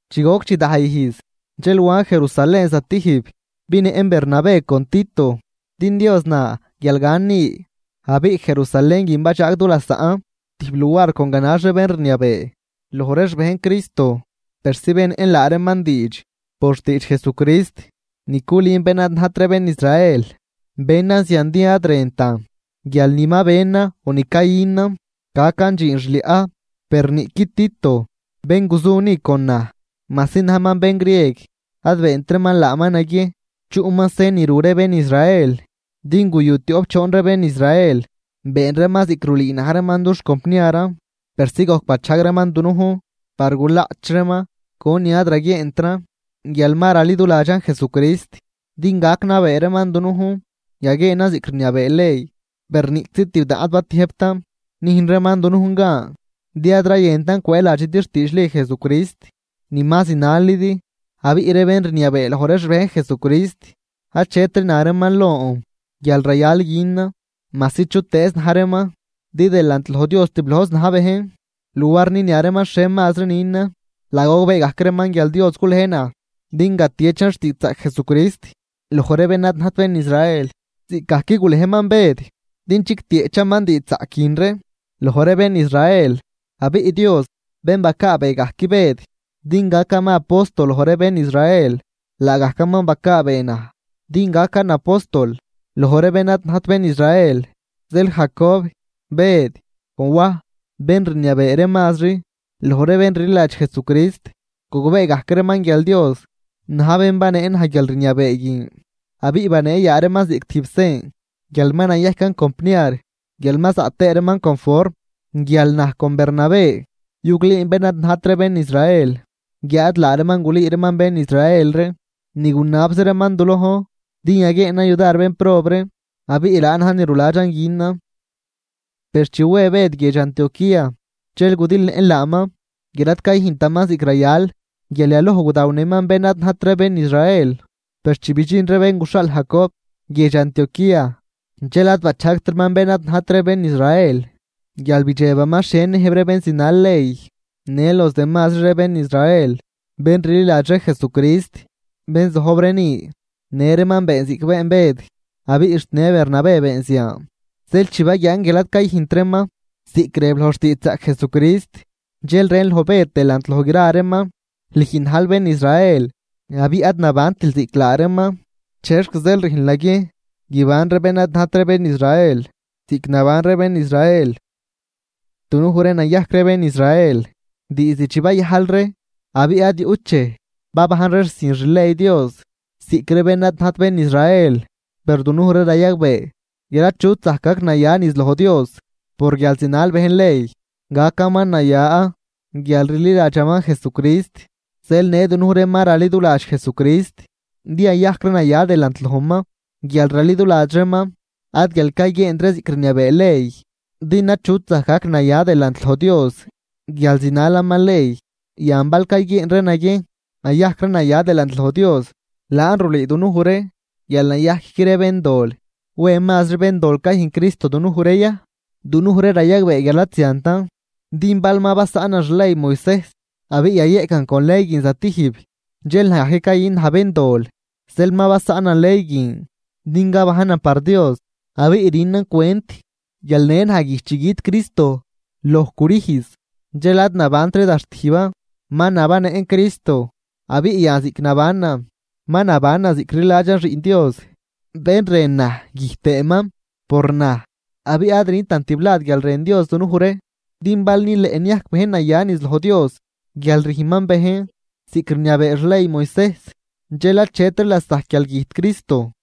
Chi goc chidaj ijz, dxel wan Jerusalén zatijb. Binëꞌn Bernabé con Tito, din Dios na guial gan ni. Abiꞌ Jerusalén guin badxaag dulasaꞌn tijb luar con ganax ree bén rniabee loj ree xbejn Cristo persi benëꞌn laa reeman diidx por xtiidx Jesucrist ni culün bén ad najt ree bén Israel. Benan zian din ad rëntan guial ni ma benan o ni cayünan gacan dxiin xliaꞌ. Per niꞌqui Tito bén guzu ni con naj, majsi najman bén grieg ad beent reeman laaman naguiejn chuꞌman sen ni ru ree bén Israel. Din guyu tioꞌp choon ree bén Israel been reeman ziꞌc rulüü na̱j reeman dux compniaran persi gojc bachajg reeman dunujn par gulaꞌch reeman conin ad raguieentran guial ma raliduladxan Jesucrist din gac nabee reeman dunujn yaguieenan ziꞌc rniabee ley. Per niꞌczi tibdaꞌn ad batiëjbtan nüjn reeman dunujn gan, din ad rayëntan cwëëladxidi xtiidxli Jesucrist ni ma zinalidi. Abiꞌ ree bén rniabee loj ree xbejn Jesucrist achetri na reeman lon guial rayal günan, majsi chutëëz na̱j reeman din delant loj Dios tiblojzi na̱j bejn. Luar ninia reeman xhie mazri nünan, laa gogbee gajc reeman guial Dios gulej naj din gatiechan xtiidxzaꞌc Jesucrist loj ree bén ad najt bén Israel, ziꞌcgajc gulejman Bëd din guitieꞌchaman diidxzaꞌc guin ree loj ree bén Israel. Abiꞌ Dios bén bacaabee gajc Bëd din gacaman apóstol loj ree bén Israel, laagajcaman bacaabee naj din gacan apóstol loj ree bén ad najt bén Israel. Zeel Jacob, Bëd con Waj bén rniabee ree mazri loj ree bén rliladx Jesucrist, gogbee gajc reeman guial Dios na̱j bén banee naj guialrniabee guin. Abiꞌ banee yaa reeman ziꞌc tijb sen guial ma nayajcan compniar guial ma zaꞌ tëë reeman conform guial naj con Bernabé yuglüün bén ad najt ree bén Israel, guiáad laa reeman gulüü reeman bén Israel ree. Ni gunabzi reeman du lojn din yaguieenan yudar bénprob ree, abiꞌ laan na̱j ni ruladxan günan. Per chi we Bëd guiedx Antioquía, dxel gudilëꞌn laaman guial ad cayüjntaman ziꞌc rayal. Guial yaloj gudawnëman bén ad najt ree bén Israel. Per chi bidxin ree bén guxhaal Jacob guiedx Antioquía, dxel ad bachajgtraman bén ad najt ree bén Israel guial bidxebaman xhie niëjb ree bén zinal ley. Në los demazri ree bén Israel bén rliladx ree Jesucrist bén zojb ree ni në reeman been ziꞌc been Bëd abiꞌ xt në Bernabé been zian. Zeel chi baguian guial ad cayüjnt reeman ziꞌc rëb loj xtiidxzaꞌc Jesucrist, dxel rën loj Bëd delant loj gra reeman: “Lüj najl bén Israel abiꞌ ad nabantil ziꞌc laa reeman, ¿chexc zeel rüjnl naguiejn guiban ree bén ad najt ree bén Israel ziꞌc naban ree bén Israel? ’Dunuj ree nayajc ree bén Israel diizd chi bayajl ree abiꞌ ad yuꞌt dxej babajn ree sin xley Dios ziꞌc ree bén ad najt bén Israel. Per dunuj ree rayagbee guial achut zajc gac naya niz loj Dios por guial zinal bejn ley, gacaman naya guial rliladxaman Jesucrist. Zeel në dunuj ree ma raliduladx Jesucrist din yayajc ree naya delant lojman guial raliduladx reeman, ad guial cayguieent ree ziꞌc rniabee ley. Din achut zajc gac naya delant loj Dios guial zinalaman ley. ’Yan bal cayguieen ree naguiejn yayajc ree naya delant loj Dios, laan rulüü dunuj ree guial nayajcqui ree béndol, ¿wen mazri béndol cayüjn Cristo dunuj ree ya? ¡Dunuj ree rayagbee guial ad ziantan! Din bal ma basaꞌnan xley Moisejs, abiꞌ yayeꞌcan con ley guin zatijb dxel naj gajc cayün naj béndol. Zeel ma basaꞌnan ley guin din gabajnan par Dios. Abiꞌ rünan cwent guial në naj güjt chi güt Cristo loj crüjz dxel ad nabantri da xtijban, ma nabannëꞌn Cristo. Abiꞌ yan ziꞌc nabanan, ma nabanan ziꞌc rliladxan Xiꞌn Dios, bén rën naj güjt tëëman por naj. Abiꞌ ad rüntan tiblad guial rën Dios dunuj ree, din bal nileꞌ niajc bejn naya niz loj Dios guial rüjn bejn ziꞌc rniabee xley Moisejs dxel achetri lasajc guial güjt Cristo.”